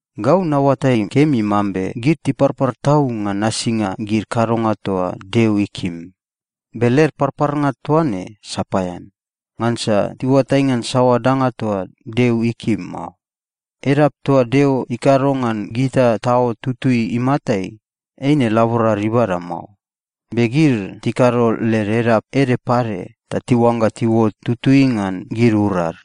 Gau naoatai kemi mambe gid tiparpar tau ngan nasinga gid kadonga toa Deo ikim. Be led parparnga toa ne sapaean, ngansa tiuatai ngan saoa danga toa Deo ikim mao. Edap toa Deo ikado ngan gita taot tutui imatai, eine laborad ibada mao. Be gid tikado led edap ede pade ta tiuangga tiuot tutui ngan gid urad.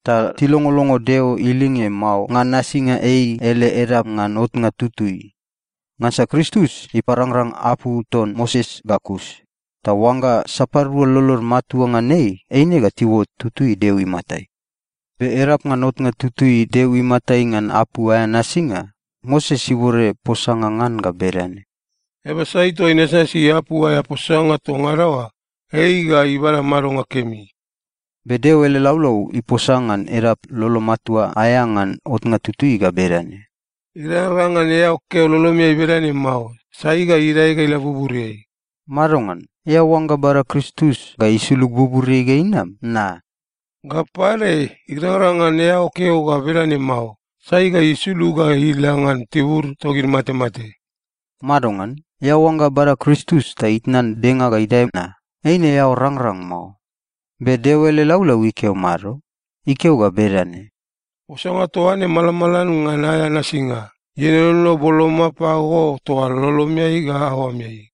Ta tilongolongo Deo ilinge mao ngan nasinga ei ele edap ngan otnga tutui. Ngansa Kristus iparangrang apu ton Moses ga kus, ta oangga sapadua lolod matua ngan ei, eine ga tiuot tutui Deo imatai. Be edap ngan otnga tutui Deo imatai ngan apu aea nasinga, Moses ibode posanga ngan ga bedane, “Eaba sai toa inasnasi apu aea posanga toa ngada oa, ei ga ibada madonga kemi.” Be Deo ele laulau iposa ngan edap lolo matua aea ngan otnga tutui ga bedane, “Irangrang ngan eao keo lolomeai bedane mao, ‘Sai ga idae ga ila buburiai?’” Madongan? Eao oangga bada Kristus ga isulug buburiai ga inam na? “Ga pade, irangrang ngan eao keo ga bedane mao, ‘Sai ga isulug ga ila ngan tibur togid matemate?’” Madongan? Eao oangga bada Kristus ta itnan denga ga idae na? Eine eao rangrang mao. Be Deo ele laulau ikeo mado? Ikeo ga bedane, “Posanga toa ne malamalan ngan aea nasinga. Ienono boloma pago, toa lolomeai ga aoameai.”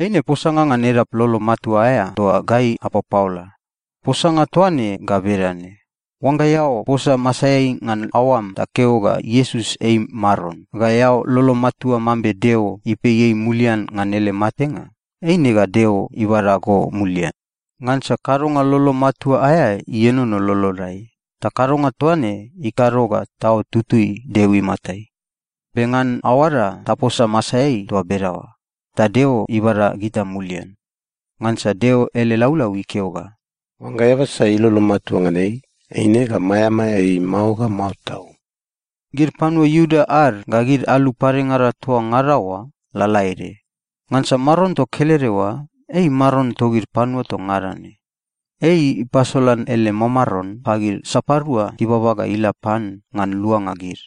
Eine posanga ngan edap lolo matua aea toa gai apapaola. Posanga toa ne ga bedane: Oangga eao posa masaeai ngan aoam ta keo ga, “Iesus ei Maron,” ga eao lolom matua mambe Deo ipei ei mulian ngan ele matenga, eine ga Deo ibada go mulian. Ngansa kadonga lolo matua aea ienono lolodai, ta kadonga toa ne ikado ga taot tutui Deo imatai. Be ngan aoada, taposa masaeai toa bedaoa, ta Deo ibada gita mulian. Ngansa Deo ele laulau ikeo ga, “Oangga eaba sai ilolo matua ngan ei, eine ga maeamaea ei mao ga mao tau.” Gid panua Iuda ad ga gid alu padengada, toa ngada oa lalaede. Ngansa Maron toa kelede oa, ei Maron togid panua toa ngada ne. Ei ipasolan ele mamaron pagid sapadua tibaba ga ila pan ngan luanga gid.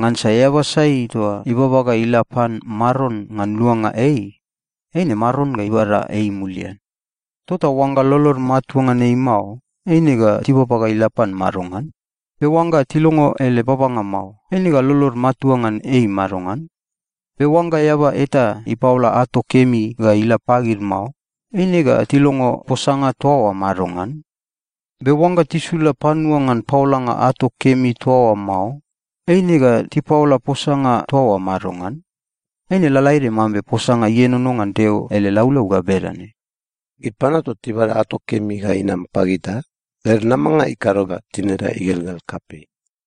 Ngansa “eaba sai toa ibaba ga ila pan Maron ngan luanga ei, eine Maron ga ibada ei mulian.” Tota oangga lolod matua ngan ei mao, eine ga tibaba ga ila pan madongan? Be oangga tilongo ele babanga mao, eine ga lolod matua ngan ei madongan? Be oangga eaba eta ipaola ato kemi ga ila pagid mao, eine ga tilongo posanga toa oa madongan? Be oangga tisula panua ngan paolanga ato kemi toa oa mao, eine ga tipaola posanga toa oa madongan? Eine lalaede mambe posanga ienono ngan Deo ele laulau ga bedane, “Gid panua toa tibada ato kemi ga inam pagita, led namanga ikado ga tinida igelgel kapei.”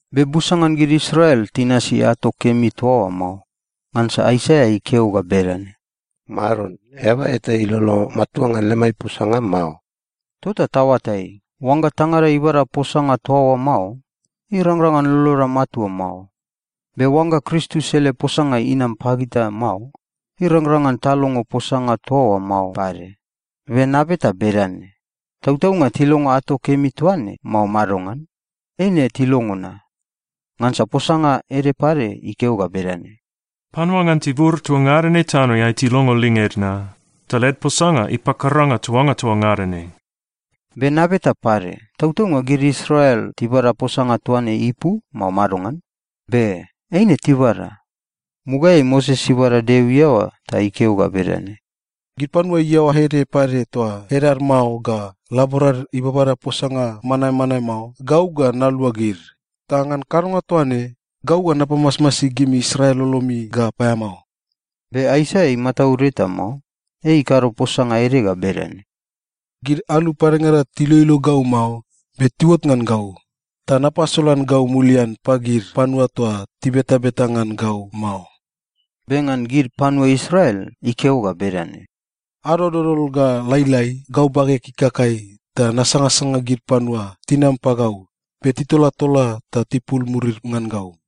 Be busa ngan gid Israel tinasi ato kemi toa oa mao. Ngansa Aisaia ikeo ga bedane, “Maron, eaba eta ilolo matua ngan lemai posanga mao!” Tota taoatai, oangga tangada ibada posanga toa oa mao, irangrang ngan loloda matua mao. Be oangga Kristus ele posanga inam pagita mao, irangrang ngan talongo posanga toa oa mao pade. Be nabeta bedane: Tautaunga tilongo ato kemi toa ne, mao madongan? Eine tilongo na. Ngansa posanga ede pade ikeo ga bedane, “Panua ngan tibur toa ngada ne tanoeai tilongo linged na. Ta led posanga ipakaranga tuanga toa ngada ne.” Be nabeta pade, tautaunga gid Israel tibada posanga toa ne ipu, mao madongan? Be, eine tibada. Mugaeai Moses ibada Deo iaoa ta ikeo ga bedane, “Gid panua iaoa ede pade toa edad mao ga laborad ibabada posanga manmanae mao, gau ga nalua gid. Ta ngan kadonga toa ne, gau ga napamasmasi gimi Israel lolomi ga paeamao.” Be Aisaia imataud eta mao. Ei ikado posanga ede ga bedane, “Gid alu padengada tiloilo gau mao, be tiuot ngan gau. Ta napasolan gau mulian pagid panua toa tibetabeta ngan gau mao.” Be ngan gid panua Israel, ikeo ga bedane, “Ado dodol ga lailai, gau bageg ikakai ta nasangasanga gid panua tinam pagau, be titolatola ta tipul murid ngan gau.”